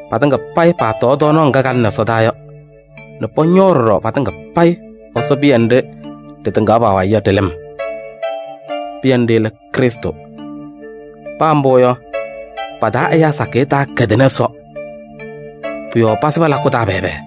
Patɩŋa payɩ paatɔɔ tɔɔnaɣ ŋga kalɩnɩ ɛsɔdaa yɔ nɛ pɔñɔɔ ɖɔɖɔ patɩŋa payɩ Ɛsɔ pɩyɛ nɖɩ ɖɩtɩŋaɣ pa-wayɩ yɔ ɖɩ-lɩm. Pɩyɛ nɖɩ lɛ Krɩstʋ. Paa mbʋ yɔ, pa-taa ɛyaa sakɩyɛ taakɛdɩnɩ Ɛsɔ. Pʋ-yɔɔ pasɩbɩ lakʋ taa pɛɛbɛɛ.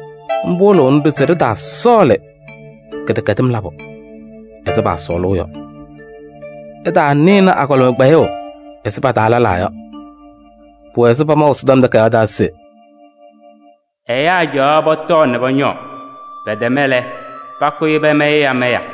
Mbʋ wɩlɩɣnɩ-ɖʋ se ɖɩtaasɔɔlɩ kɩdɛkɛdɩm labʋ ɛzɩ paasɔɔlʋʋ yɔ. Ɩtaanɩnɩ agɔlɩma kpɛyʋʋ ɛzɩ pa-taa lɛlaa yɔ. Pʋwɛ ɛzɩ pamaʋ Ɛsɔtɔm Takayaɣ taa se: “Ɛyaa caɣaɣ pɔtɔɔ nɛ pɔñɔɔ, pɛtɛma lɛ, pakʋyɩ pamayɩ amaya” yɔ.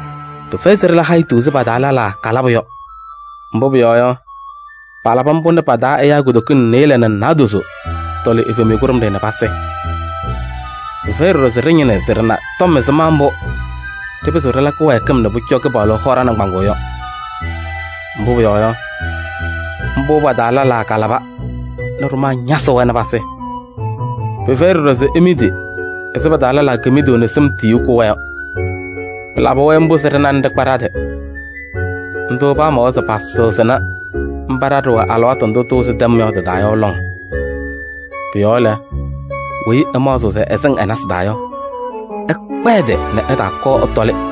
Pɩfɛyɩ se ɖɩla hayitu ɛzɩ pa-taa lɛlaa kalabʋ yɔ. Mbʋ pʋyɔɔ yɔ, palabɩ mbʋ nɛ pa-taa ɛyaa kutokiŋ nɩɩlɛ nɛ naadozo tɔlɩ evemiye kʋɖʋmɖɩyɛ nɛ pasɩ. Pɩfɛyɩ ɖɔɖɔ se ɖɩñɩnɩ se ɖɩna tɔm ɛzɩma mbʋ ɖɩpɩzɩɣ ɖɩla kɩwɛɛkɩm nɛ pʋcɔ Kɩpaɣlʋ hɔ ɖa-nɩŋgbaŋʋʋ yɔ. Mbʋ pʋyɔɔ yɔ, mbʋ pa-taa lɛlaa kalaba nɛ ɖʋmaa ñasɩ-wɛ nɛ pasɩ. Pɩfɛyɩ ɖɔɖɔ se imidi ɛzɩ pa-taa lɛlaa kemiduu nɛ sɩm tiyiyu kʋ-wɛ yɔ. Pɩlabɩ-wɛ mbʋ se ɖɩna nɛ ɖɩkpa ɖa-tɩ. Ndʋ pamawa se pasɩɣzɩnɩ mba ɖa ɖɩwɛ alɩwaatʋ ndʋ tɩwɩzɩ tɛm yɔ tɩ-taa yɔ lɔŋ. Pʋ-yɔɔ lɛ, weyi ɛmaɣzɩɣ se ɛsɩŋ ɛ-nasɩ taa yɔ, ɛkpa ɛ-tɩ nɛ ɛtaakɔɔ ɛtɔlɩ.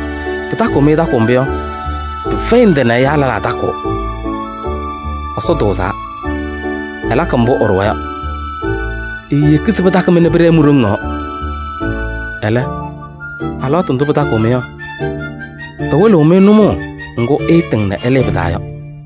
Pɩtakɩɣ-mɩ takʋʋ mbʋ yɔ, pɩfɛyɩ ndɩ nɛ ɛyaa lɛlaa takʋʋ. Ɛsɔ tʋʋzaa, ɛlakɩ mbʋ ɛɖʋwa yɔ. Eeyeki se pɩtakɩ-mɩ nɛ pɩɖɛɛ mi-ɖoŋ yɔɔ. Ɛlɛ, alɩwaatʋ ndʋ pɩtakɩɣ-mɩ yɔ, ɛwɩlɩɣ-mɩ nʋmɔʋ ŋgʋ ɩɩtɩŋ nɛ ɩlɩɩ pɩ-taa yɔ.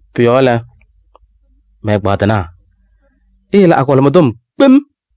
Pʋ-yɔɔ lɛ, mɛ-ɛgbaadɩnaa, iyele agɔlɩma tɔm kpem.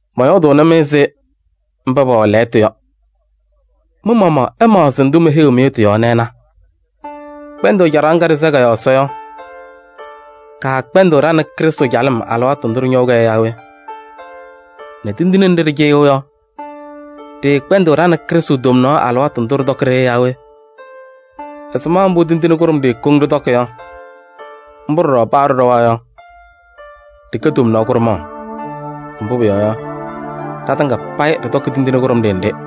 Mɔyɔɔdʋʋnɩ-mɩ ɛzɩ mba pɛwɛ lɛɣtʋ yɔ. Mɩ-maɣmaɣ ɩmaɣzɩ ndʋ meheyiɣ-mɩ yɔ tɩ-yɔɔ nɛ ɩna. Kpɛndʋʋ caɖaɣ ŋga ɖɩsɛɣ kɔ-yɔɔ Ɛsɔ yɔ, kaakpɛndɩɣ ɖa nɛ Krɩstʋ calɩm alɩwaatʋ ndʋ ɖɩñɔʋ-kɛ yɔ yaa we? Nɛ tindine nɖɩ ɖɩcɩyɩɣ yɔ, ɖɩɩkpɛndɩɣ ɖa nɛ Krɩstʋ tomnaɣ alɩwaatʋ ndʋ ɖɩtɔkɩ-ɖɩ yɔ yaa we? Ɛzɩma mbʋ tindine kʋɖʋmɖɩyɛ koŋ ɖɩtɔkɩ yɔ, mbʋ ɖɔɖɔ paa ɖɩɖɔwa yɔ, ɖɩkɛ tomnaɣ kʋɖʋmaɣ. Mbʋ pʋyɔɔ yɔ, ɖatɩŋa payɩ ɖɩtɔkɩ tindine kʋɖʋmɖɩyɛ nɖɩ.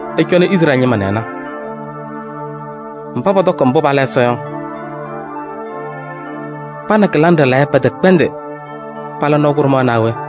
Ɩcɔnɩ Izrɛɛlɩ ñɩma nɛ ɩna: mba pɔtɔkɩ mbʋ pala Ɛsɔ yɔ, pa nɛ kɩlaŋ ɖɩlayɛ pɛtɛkpɛndɩ pala kʋɖʋm naa we?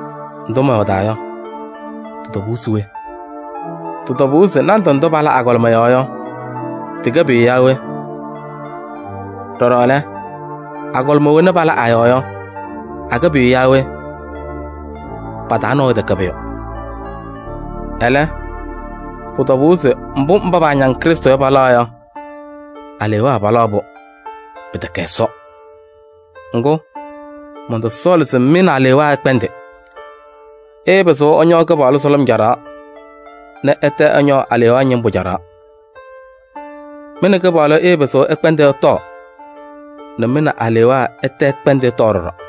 Ndʋ mɔyɔɔdaa yɔ, tɩ-tɔbʋʋ se we? Tɩ-tɔbʋʋ se nandʋ ndʋ pala agɔlɩma yɔɔ yɔ, tɩkɛ pʋyʋ yaa we? Ɖɔɖɔ lɛ, agɔlɩma wena pala a-yɔɔ yɔ, akɛ pʋyʋ yaa we? Pa-taa nabʋyʋ tɛkɛ pʋyʋ. Ɛlɛ, pʋ-tɔbʋʋ se mbʋ mba paañaŋ Krɩstʋ yɔ palaɣ yɔ, alewaa palaɣ-pʋ, pɩtɛkɛ Ɛsɔ. Ŋgʋ, mɔntɔsɔɔlɩ se mɩ nɛ alewaa ɩkpɛndɩ. Ɩɩpɩzɩɣ ɩñɔɔ Kɩpaɣlʋ sʋlʋm caɖaɣ nɛ ɩtɛ ɩñɔɔ alewaa ñɩmbʋ caɖaɣ. Mɩ nɛ Kɩpaɣlʋ ɩɩpɩzɩɣ ɩkpɛndɩ ɩtɔɔ nɛ mɩ nɛ alewaa ɩtɛ ɩkpɛndɩ ɩtɔɔ ɖɔɖɔ.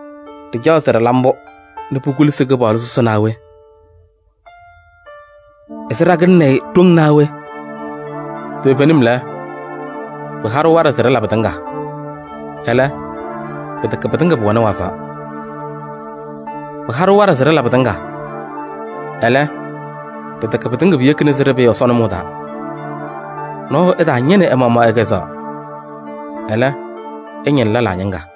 Ɖɩcaɣ se ɖɩla mbʋ nɛ pukulusi Kɩpaɣlʋ sʋsɩ naa we? Ɛzɩ ɖakɩlɩnɩ-ɩ ɖoŋ naa we? Toovenim lɛ: “Pɩha-ɖʋ waɖɛ se ɖɩla pɩtɩŋa.” Ɛlɛ, pɩtɛkɛ pɩtɩŋa pʋwɛnɩ wazaɣ. “Pɩha-ɖʋ waɖɛ se ɖɩla pɩtɩŋa.” Ɛlɛ, pɩtɛkɛ pɩtɩŋa piyekina se ɖɩpɩɩ Ɛsɔ nʋmɔʋ taa. Nɔɔyʋ ɛtaañɩnɩ ɛ-maɣmaɣ ɛ-kɛzɛɣa. Ɛlɛ, ɛñɩnɩ lɛlaa ñɩŋga.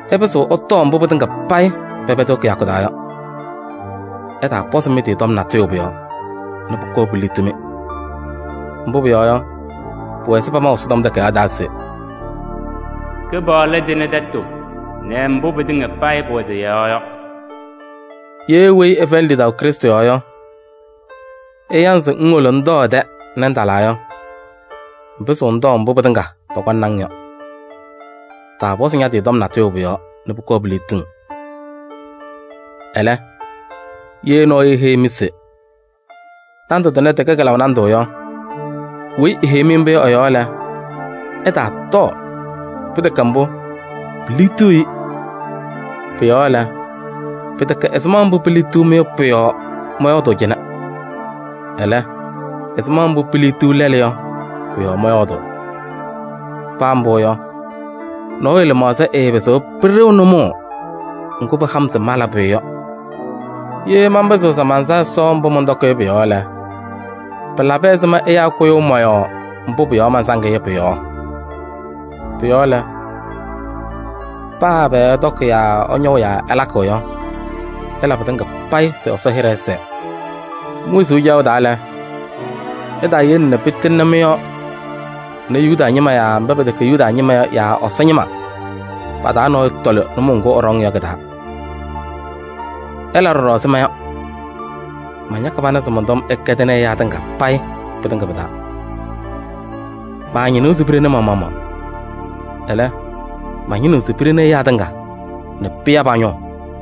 Ɩpɩzɩɣ ɩtɔɔ mbʋ pɩtɩŋa payɩ pɛpɛdɩɣ kɩyakʋ taa yɔ. Ɩtaapɔzɩ mɩ-tɩ tɔm natʋyʋ pʋ-yɔɔ nɛ pʋkɔɔ piliɣti-mɩ. Mbʋ pʋyɔɔ yɔ, pʋwɛ ɛzɩ pamaʋ Ɛsɔtɔm Takayaɣ taa se: “Kɩpaɣlʋ tɩnɩ tɛtʋ nɛ mbʋ pɩtɩŋa payɩ pʋwɛ tɩ-yɔɔ yɔ.” Ye weyi ɛfɛyɩnɩ lidaʋ Krɩstʋ yɔɔ yɔ, ɛya-ŋ se ŋwolo ŋtɔɔ ɛ-tɛ nɛ ŋtalɩ yɔ, ŋpɩzɩɣ ŋtɔɔ mbʋ pɩtɩŋa pɔkɔŋnɩ-ŋ yɔ. Taapɔzɩ ña-tɩ tɔm natʋyʋ pʋ-yɔɔ nɛ pʋkɔɔ piliɣti-ŋ. Ɛlɛ, ye nɔɔyʋ eheyi-mɩ se: “Nandʋ tʋnɛ tɩkɛ kɩlaʋ nandʋ” yɔ, weyi eheyi-mɩ mbʋ yɔ ɛ-yɔɔ lɛ, ɩtaatɔɔ. Pɩtɛkɛ mbʋ, piliɣtiɣ-i. Pʋ-yɔɔ lɛ, pɩtɛkɛ ɛzɩma mbʋ piiliɣti-mɩ yɔ pʋ-yɔɔ mɔyɔɔdʋʋ cɩnɛ. Ɛlɛ, ɛzɩma mbʋ piiliɣti lɛlʋ yɔ pʋ-yɔɔ mɔyɔɔdʋʋ. Paa mbʋ yɔ, nɔɔyʋ lɩmaɣza ɛɛpɩzɩɣ pɩɖɩɣ nʋmɔʋ ŋgʋ pɩha-m se mala pʋyʋ yɔ. Ye manpɩzɩɣ se mansa Ɛsɔ mbʋ mɔntɔkɩ yɔ pʋ-yɔɔ lɛ, pɩlabɩ ɛzɩma ɛyaa kʋyʋʋ mɔ-yɔɔ mbʋ pʋ-yɔɔ mansaŋ-ɩ yɔ pʋ-yɔɔ? Pʋ-yɔɔ lɛ, paa ɛbɛ ɩtɔkɩ yaa ɩñɔʋ yaa ɩlakɩ yɔ, ɩla pɩtɩŋa payɩ se Ɛsɔ hɩɖɛ ɛsɛɛ. Mi-wezuu caɣʋ taa lɛ, ɩtaayele nɛ pɩtɩŋnɩ mɩ-yɔɔ nɛ Yuda ñɩma yaa mba pɛtɛkɛ Yuda ñɩma yɔ yaa Ɛsɔ ñɩma pa-taa nɔɔyʋ tɔlɩ nʋmɔʋ ŋgʋ ɛɖɔŋ yɔ kɩ-taa. Ɩla ɖɔɖɔ ɛzɩ ma yɔ: mañakɩ pana se mɔn-tɔm ɛkɛdɩnɩ ɛyaa tɩŋa pɩtɩŋa pɩ-taa. Maañɩnɩɣ se piɖeni ma-maɣmaɣ. Ɛlɛ, mañɩnɩɣ se piɖeni ɛyaa tɩŋa nɛ pɩya pa-ñʋʋ.